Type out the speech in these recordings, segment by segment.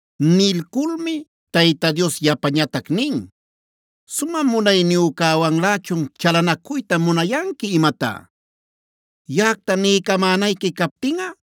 Nilculmi Tayta Dios yapañatac nin: “¿Sumä Munayniyücäwanlächun chalanacuyta munayanqui imatá? Yaꞌacta niycamänayqui captinꞌa,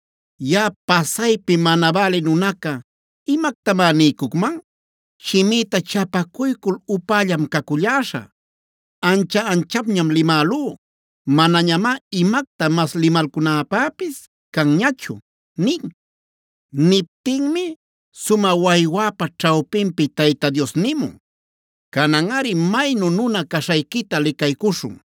“Yaꞌa pasaypi mana bälï nunaca ¿imactamá niycucman? Shimïta chapacuycul upällam caculläśhä. Ancha-anchapñam limälú; manañamá imacta mas limalcunäpäpis canñachu” nin. Niptinmi sumä waywäpa ćhawpinpi Tayta Dios nimun: “Cananꞌari maynu nuna-nuna caśhayquita licaycuśhun;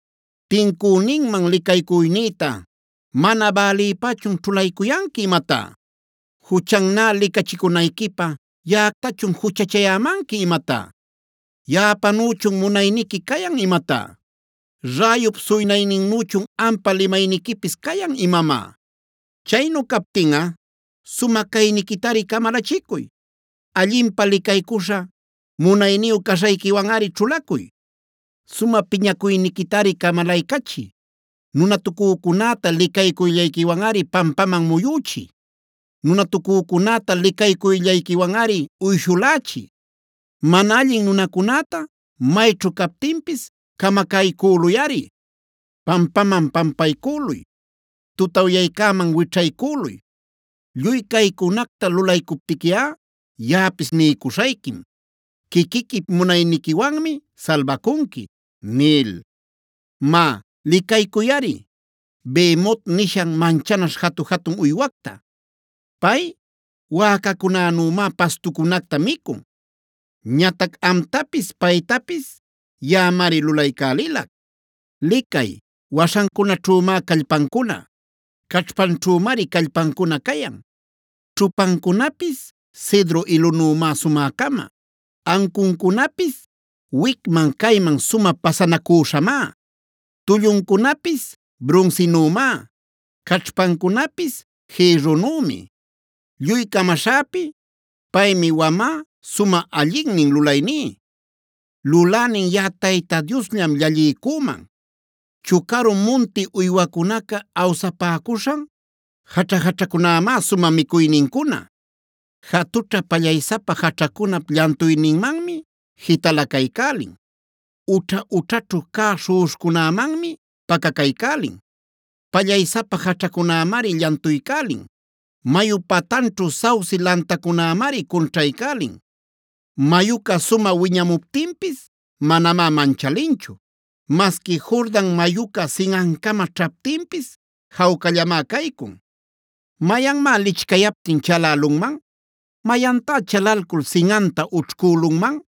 ¿Tincüninman licaycuynïta mana bälïpächun ćhulaycuyanqui imatá? ¿Juchannä licachicunayquipä yaꞌactachun juchachayämanqui imatá? ¿Yaꞌapanüchun munayniqui cayan imatá? ¿Räyup suynayninnüchun ampa limayniquipis cayan imamá? Chaynu captinꞌa, sumä cayniquitari camalachicuy; allinpä licaycuśha, munayniyu caśhayquiwanꞌari ćhulacuy. Sumä piñacuyniquitari camalaycachiy; nunatucücunäta licaycuyllayquiwanꞌari pampaman muyüchiy. Nunatucücunäta licaycuyllayquiwanꞌari uyshulächiy; mana allin nunacunäta mayćhu captinpis camacaycüluyꞌari. Pampaman pampaycüluy; tutawyaycäman wićhaycüluy. Lluy caycunacta lulaycuptiquiꞌa yaꞌapis niycuśhayquim: ‘Quiquiquip munayniquiwanmi salbacunqui’ nil. “Má, licaycuyꞌari Behemotc nishan manchanaśh jatu-jatun uywacta. Pay wäcacunänümá pastucunacta micun. Ñatac amtapis paytapis yaꞌamari lulaycälilac. Licay, waśhancunaćhümá callpancuna; caćhpanćhümari callpancuna cayan. Ćhupancunapis cedro ilunümá sumä-cama; ancuncunapis wicman-cayman sumä pasanacüśhamá. Tulluncunapis brunsinümá; caćhpancunapis jïrrunümi. “Lluy camaśhäpi, paymi wamä sumä allinnin lulayní; lulänin yaꞌa Tayta Diosllam llalliycüman. Chucaru munti uywacunaca awsapäcuśhan jaćha-jaćhacunämá sumä micuynincuna. Jatućha pallaysapa jaćhacunap llantuyninmanmi jitalacaycälin; ućha-ućhaćhu cä śhuꞌuśhcunämanmi pacacaycälin. Pallaysapa jaćhacunämari llantuycälin; mayu patanćhu sauce lantacunämari cunćhaycälin. Mayuca sumä wiñamuptinpis manamá manchalinchu; masqui Jordan mayuca sinꞌancama ćhaptinpis jawcallamá caycun. ¿Mayanmá lichcayaptin chalälunman? ¿Mayantá chalalcul sinꞌanta ućhcülunman?